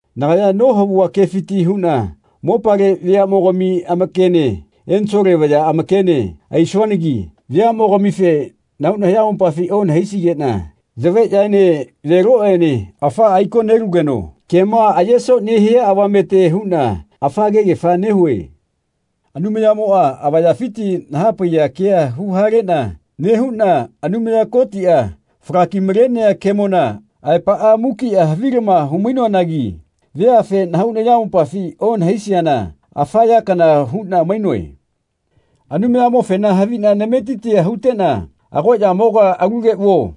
Nagaya nohavua kefiti huꞌna mopale veaꞌmogami amakene Ensole vaya amakene aisuanagi veaꞌmogamife nahau nayamopafi onahaisigeꞌna yaveꞌyaene veloꞌene afaꞌa aiko nelugeno kema ayeso nehia avamete huꞌna afa kegefa nehue. Anumayamoꞌa avayafiti nahapaiya kea huhaleꞌna nehuꞌna Anumaya Kotiꞌa falaki-malenea kemona aepaꞌa mukiꞌa havilama humainoanagi veafe nahau nayamopafi onahaisiana afa ya kana huꞌna mainoe. Anumayamofena haviꞌna nametitia huteꞌna “Agoꞌyamoga alule vuo.”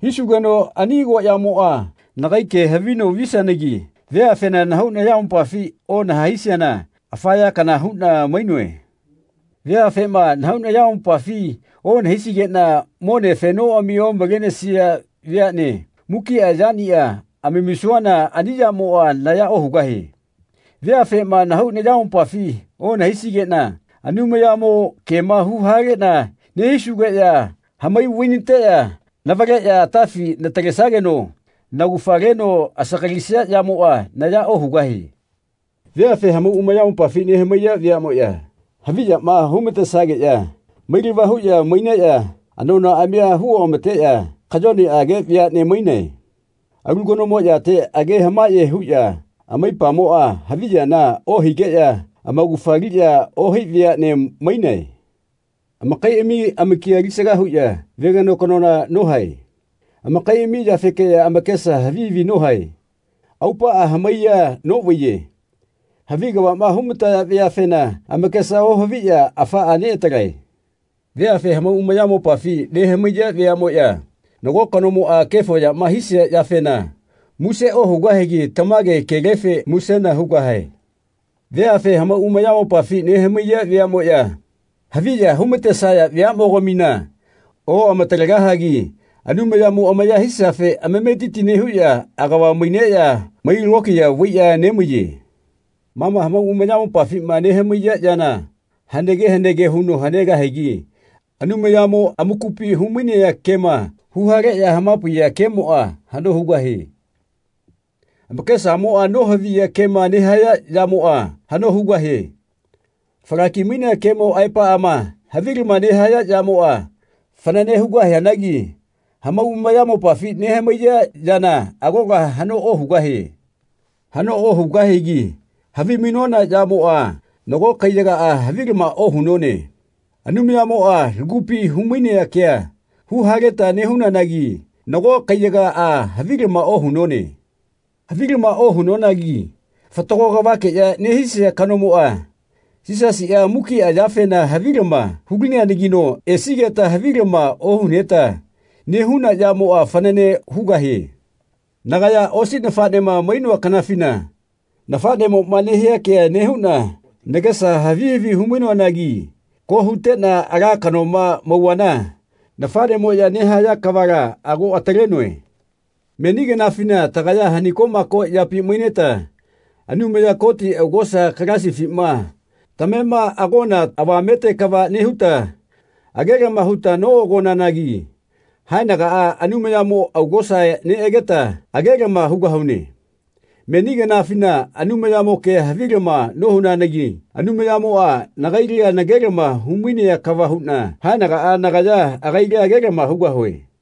hisugeno ani agoꞌyamoꞌa nagai ke havino visianagi veafena nahau nayamopafi onahaisiana afa ya kana huꞌna mainoe. Veafema nahau nayamopafi onahaisigeꞌna mone afenoꞌami omalenesia veaꞌne mukiꞌa yaniꞌa amamisuana ani yamoꞌa naya ohugahie. Veafema nahau nayamopafi onahaisgeꞌna Anumayamo kema huhaleꞌna nehisugeꞌya hamai vainateꞌya navaleꞌya atafi natalesageno naugafa leno asagalisia yamoꞌa naya ohugahie. Veafe hamau amayamopafi nehamaiya veaꞌmoꞌya haviyama humatesageꞌya mailava huꞌya maineꞌya anonaꞌamia huoꞌamateꞌya kayoneꞌage veaꞌne mainae. Alu kanomo yate age hamaꞌye huꞌya amaipamoꞌa haviyana ohigeꞌya amaugafa aliꞌya ohai veaꞌne mainae. Amakaiꞌami amakia alisaga huꞌya veganokanola nohae. Amakaiꞌami yafekela amakesa havi havi nohae. Aupaꞌa hamaiya noꞌvaiye. Havi kavaꞌma humataya veafena amakesa ohaviꞌya afaꞌa neꞌatalae. Veafe hamau amayamopafi nehamaiya veaꞌmoꞌya nago kanomoꞌa kefo yama hisia yafena muse ohugahagi tamage kelefe musena hugahae. Veafe hamau amayamopafi nehamaiya veaꞌmoꞌya haviya humatesaya veaꞌmogamina oꞌamatalegahagi Anumayamo amaya hisiafe amametiti nehuꞌya agava maineꞌya mai lokiya vaiꞌya nemaiye. Ma ma hamau amayamopafima nehamaiya yana hanege hanege huno hanegahianagi Anumayamo amakupi humainea kema huhaleꞌya hamapaiya kemoꞌa haꞌno hugahie. Amakesamoꞌa nohaviya kema nehaya yamoꞌa haꞌno hugahie. Falaki-mainea kemo aepaꞌama havilama nehaya yamoꞌa fanane hugahianagi hamau amayamopafi nehamaiya yana agola haꞌno ohugahie. Haꞌno ohugahigi havimainona yamoꞌa nago kaiyagaꞌa havilama ohunone. Anumayamoꞌa lagupi humainea kea huhaleta nehunanagi nago kaiyagaꞌa havilama ohunone. Havilama ohunonagi fatago kavakeꞌya nehisia kanomoꞌa, Yisasiꞌa, mukiꞌa yafena havilama hulineanagino esigeta havilama ohuneta nehuna yamoꞌa fanane hugahie. Nagaya osi nafaꞌnema mainoa kanafina nafaꞌnemoꞌma nehia kea nehuꞌna nagesa havi havi humainoanagi ko huteꞌna ala kanoma mauvana nafaꞌnemoꞌya nehaya kavala ago atalenoe. Meni kanafina tagaya hanikoꞌmako yapi maineta Anumaya Koti augosa galasifima tamema agona avamete kava nehuta agelama huta noꞌagonanagi haenagaꞌa Anumayamo augosa neꞌageta agelama hugahune. Meni kanafina Anumayamo kea havilama nohunanagi Anumayamoꞌa nagaila nagelama humainea kava huꞌna haenagaꞌa nagaya agaila agelama hugahue.